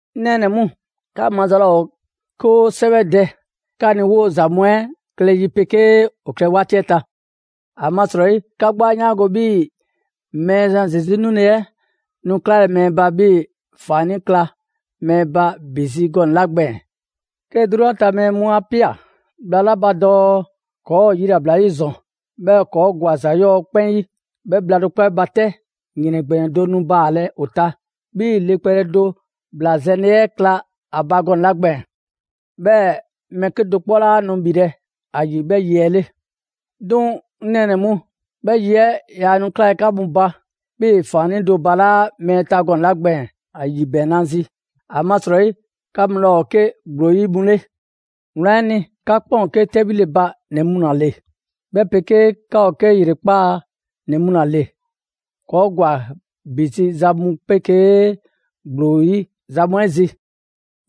'Ŋ nɛɛnɛ‑ mu, 'ka maza laa ‑o 'ke 'o 'sɛwɛdɛ 'ka ni 'woo‑ ‑za mu 'ɛ klɛ yi 'ɛ 'pegee ‑o klɛ 'waati 'ɛ ta. ‑Amasrɔyi 'ka 'gbu 'a 'yaango‑ 'bhii‑ Mɛɛzan Zesu 'nule 'ɛ nu 'klalɛ‑ mɛɛ ba, 'bhii‑ ‑faannii' kla mɛɛ ba ‑bi zi gɔnɛ‑ 'la gbɛɛn‑. 'Ke 'drunyan ta mɛɛ 'a ꞊pia bhla 'la ba dɔɔ: «‑Kɔɔ' ‑o yilabla 'yi ‑zɔn, 'bhɛɛ‑ ‑kɔɔ' ‑gwa ‑za 'yɔɔ‑ 'kpɛn 'yi.» 'Bhɛ bhla do 'kpɔ 'ɛ ba 'tɛ, ‑yrɛn ‑gbɛnɛ do nu baalɛ ‑o ta, 'bhii‑ le kpɛle do ‑bla zɛnle 'ɛ kla ‑a ba gɔnɛ‑ 'la gbɛɛn‑; 'bhɛɛ‑ mɛɛ 'kedo‑ 'kpɔ 'laa nu ‑bhilɛ' ‑a ‑yi 'bhɛ yi 'ɛ 'le. 'Duŋ‑, 'ŋ nɛɛnɛ‑ mu, 'bhɛ yi 'ɛ yaa nu 'klalɛ‑ 'ka mu ba 'bhii‑ ‑faannii' do balaa' mɛɛ ta gɔnɛ‑ 'la gbɛɛn‑ ‑a ‑yibɛɛnnazi. ‑Amasrɔyi 'ka mu 'laa ‑o 'ke ‑gblo 'yi mu 'le. Wlan 'ɛ ni, 'ka 'kpɛn ‑o 'ke 'tɛbhile ba ‑nɛ mu ‑la ‑le, 'bhɛ 'pegee 'ka ‑o 'ke ‑yrekpaa' ‑nɛ mu ‑la ‑le. ‑Kɔɔ' ‑gwa ‑bi zi za mu 'pegee ‑gblo 'yi za mu 'ɛ zi.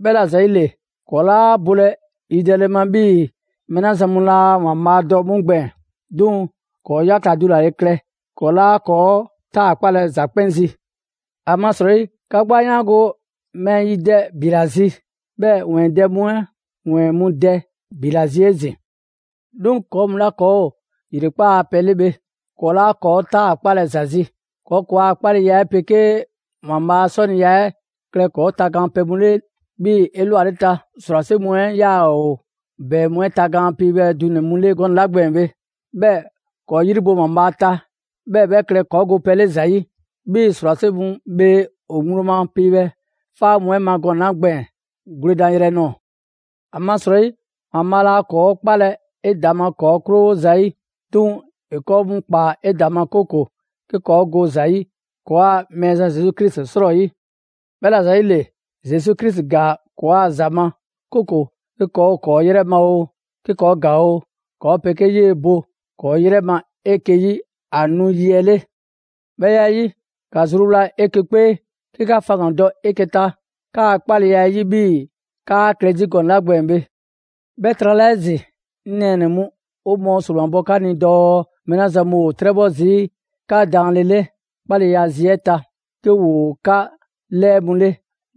'Bhɛla‑ ‑yile, ‑kɔɔ' 'laa bolɛ yidɛle ma 'bhii mɛɛ 'la zan mu laa ‑Waanbhaa' dɔ 'mu gbɛɛn‑. 'Duŋ‑ ‑kɔɔ' 'yakla‑ dulale klɛ, ‑kɔɔ' 'laa ‑kɔɔ' 'taakpalɛ ‑za 'kpɛn zi. ‑Amasrɔyi, 'ka 'gbu 'a 'yaango‑ mɛɛ yidɛ ‑bi ‑la zi, 'bhɛɛ‑ ‑wɛɛn dɛ mu 'ɛ ‑wɛɛn 'mu dɛ ‑bi ‑la zi 'ezin‑. 'Duŋ‑ ‑kɔɔ' mu 'la ‑kɔɔ' ‑o ‑yrekpaa' a pɛ 'le bhe, ‑kɔɔ' 'laa ‑kɔɔ' 'taakpalɛ ‑za zi. ‑Kɔɔ' ‑kɔɔa' 'kpaleya 'ɛ 'pegee ‑Waanbhaa' a 'sɔniya 'ɛ klɛ ‑kɔɔ' tagaan pɛ mu 'le 'bhii‑ 'elwaleta ‑srwase' mu 'ɛ 'yaa‑ ‑o ‑bɛɛ mu 'ɛ tagaan piibhɛ dunɛ‑ mu 'le gɔnɛ‑ 'la gbɛɛn‑ bhe. 'Bhɛɛ‑ ‑kɔɔ' 'yri bo ‑Waanbhaa' ta, 'bhɛɛ‑ 'bhɛ klɛ ‑kɔɔ' go pɛ 'le ‑za 'yi, 'bhii‑ ‑srwase' mu bhee ‑o ŋgblo ma piibhɛ 'faa mu 'ɛ ma gɔnɛ‑ 'la gbɛɛn‑ gwledan yrɛ nɔɔ‑. ‑Amasrɔyi, ‑Waanbhaa' laa ‑kɔɔ' 'kpalɛ‑ 'edaŋma ‑kɔɔ' 'krowo ‑zayi'. 'Duŋ‑ ‑e ‑kɔɔ' mu ꞊kpaa 'edaŋma, 'kooko‑ 'ke ‑kɔɔ go ‑za 'yi ‑kɔɔa' Mɛɛzan Zesu Krisi 'srɔyi. 'Bhɛla‑ ‑yile, Zesu Krisi ‑gaa ‑kɔɔa' ‑za ma, 'kooko‑ 'ke ‑kɔɔ' ‑o ‑kɔɔ' 'yrɛ ma oo, 'ke ‑kɔɔ' ‑gaa oo, ‑kɔɔ' 'pegee 'yee‑ bo ‑kɔɔ' 'yrɛ ma 'eke‑ 'yi ‑a nu yi 'ɛ 'le. 'Bhɛ ya 'ɛ 'yi, ‑ka zruwla 'eke‑ 'kpee 'ke 'ka faŋgandɔ 'eke‑ ta 'kaa‑ 'kpaleya 'ɛ 'yi 'bhii‑ 'kaa‑ klɛ zi gɔnɛ‑ 'la gbɛɛn‑ bhe. 'Bhɛ trala 'ezin‑, 'ŋ nɛɛnɛ‑ mu, 'o mɔɔ ‑sromabɔ 'ka ni dɔɔ mɛɛ 'la zan mu ‑o 'trɛbhɔ zii' 'ka daanle 'le 'kpaleya zi 'ɛ ta, 'ke ‑woo 'ka 'lɛɛ mu 'le,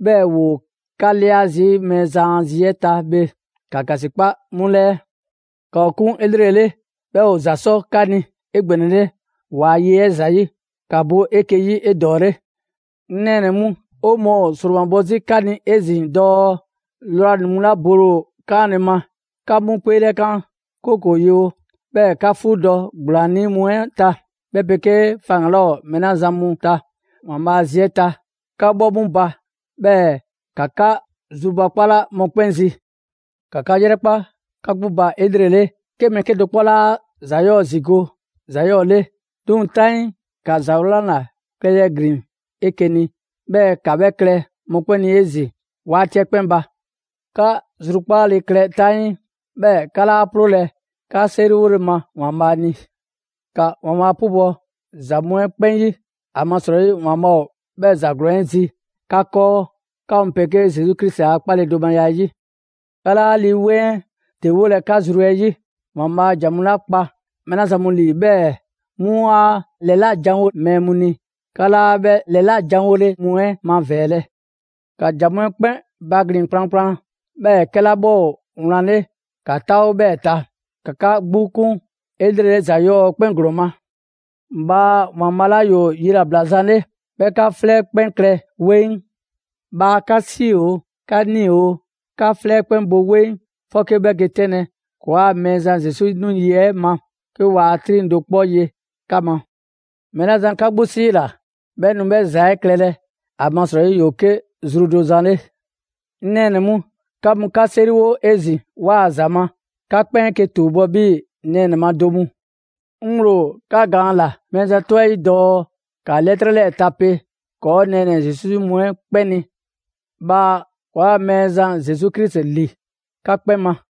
'bhɛɛ‑ ‑woo 'ka 'lia zii' Mɛɛzan a zi 'ɛ ta bhe, ‑ka ‑gasikpa 'mu 'lɛɛ. ‑Ka ‑o 'kun 'elrele, 'bhɛɛ‑ ‑o ‑za 'sɔ 'ka ni 'egbɛnɛle ‑waa' ye 'ɛ ‑zayi'. ‑Ka bo 'eke‑ 'yi 'edɔɔle. 'Ŋ nɛɛnɛ‑ mu, 'o mɔɔ ‑o ‑sromabɔ 'zi 'ka ni 'ezin‑ dɔɔ lrwanii‑ mu 'la bole ‑o 'kaanle‑ ma, ‑ka 'mu 'kpeelɛkan, 'kooko‑ ‑o yewo, 'bhɛɛ‑ ‑ka 'fuudɔ‑ ‑gblaannii' mu 'ɛ ta, 'bhɛ 'pegee faŋgan‑ 'laa ‑o mɛɛ 'la zan mu ta ‑Waanbhaa' zi 'ɛ ta, ‑ka bhɔ 'mu ba. 'Bhɛɛ‑ ‑ka 'ka zrubakpala mɔkpɛn' zi. ‑Ka 'ka 'yrɛkpa 'ka 'gbu ba 'elrele, 'ke mɛɛ 'kedo‑ 'kpɔ 'laa ‑za 'yɔɔ‑ ‑zigo' ‑za 'yɔɔ‑ 'le. 'Duŋ‑ 'taŋii, ‑ka ‑za 'wlan ‑la klɛyrɛ ‑glin 'eke‑ ni, 'bhɛɛ‑ ‑ka 'bhɛ klɛ mɔkpɛn' ni 'ezin‑ 'waati 'ɛ 'kpɛn ba. 'Ka zrukpaale klɛ 'taŋii. 'Bhɛɛ‑ 'ka 'laa 'ploolɛ‑ 'ka 'seriwole ma ‑Waanbhaa' ni. ‑Ka ‑Waanbhaa' 'pubɔ‑ ‑za mu 'ɛ 'kpɛn 'yi. ‑Amasrɔyi ‑Waanbhaa' ‑o 'bhɛɛ‑ ‑za ‑glɔɔn 'ɛ zi 'ka 'kɔɔ, 'ka mu 'pegee Zesu Krisi a 'kpaledomaya 'ɛ 'yi. 'Ka 'laa Lii 'Weŋ 'ɛ ‑dewolɛ 'ka zru 'ɛ 'yi. ‑Waanbhaa' ‑jan mu kpa mɛɛ 'la zan mu ‑lii, 'bhɛɛ‑ 'mu 'a ‑lɛlajanwo mɛɛ mu ni, 'ka 'laa 'bhɛ ‑lɛlajanwole mu 'ɛ mavɛɛlɛ. ‑Ka ‑jan mu 'ɛ 'kpɛn baglin‑ kplankplan, 'bhɛɛ‑ 'kɛla 'bhɛ ‑o wlan 'le ‑ka 'taawo 'bhɛɛ‑ ta. ‑Ka ‑ka 'ka 'gbu 'kun 'elrele ‑za 'yɔɔ‑ 'kpɛn ‑glɔɔn ma. Bhaa ‑Waanbhaa' 'la ‑yoo yilabla zan 'le, 'bhɛ 'ka 'flɛ 'kpɛn klɛ 'weŋ. Bhaa 'ka 'si oo, 'ka 'nii‑ oo, 'ka 'gbu 'flɛ 'ɛ 'kpɛn bo 'weŋ 'fɔke 'bhɛ ge 'tɛnlɛ‑ ‑kɔɔa' Mɛɛzan Zesu nu yi 'ɛ ma, 'ke waa 'triŋ‑ do 'kpɔ ye 'ka ma. Mɛɛ 'la zan 'ka 'gbu 'siila‑, 'bhɛ nu 'bhɛ ‑za 'ɛ klɛlɛ; ‑amasrɔyi ‑yoo 'ke zru do zan 'le. 'Ŋ nɛɛnɛ‑ mu, 'ka mu 'ka 'seriwo 'ezin‑ 'waa‑ ‑za ma. 'Ka 'kpɛn 'eke‑ ‑tuubɔ' 'bhii‑ nɛɛnɛ‑ ma do mu. 'Ŋ ŋgblo ‑o 'ka gaan ꞊la Mɛɛzan 'tɔ 'yi 'ɛ dɔɔ: ‑Ka 'lɛtrɛ 'lɛɛ‑ tape ‑kɔɔ' nɛɛnɛ‑ Zesu 'yi mu 'ɛ 'kpɛn ni. Bhaa ‑kɔɔa' Mɛɛzan Zesu Krisi ‑li 'ka 'kpɛn ma.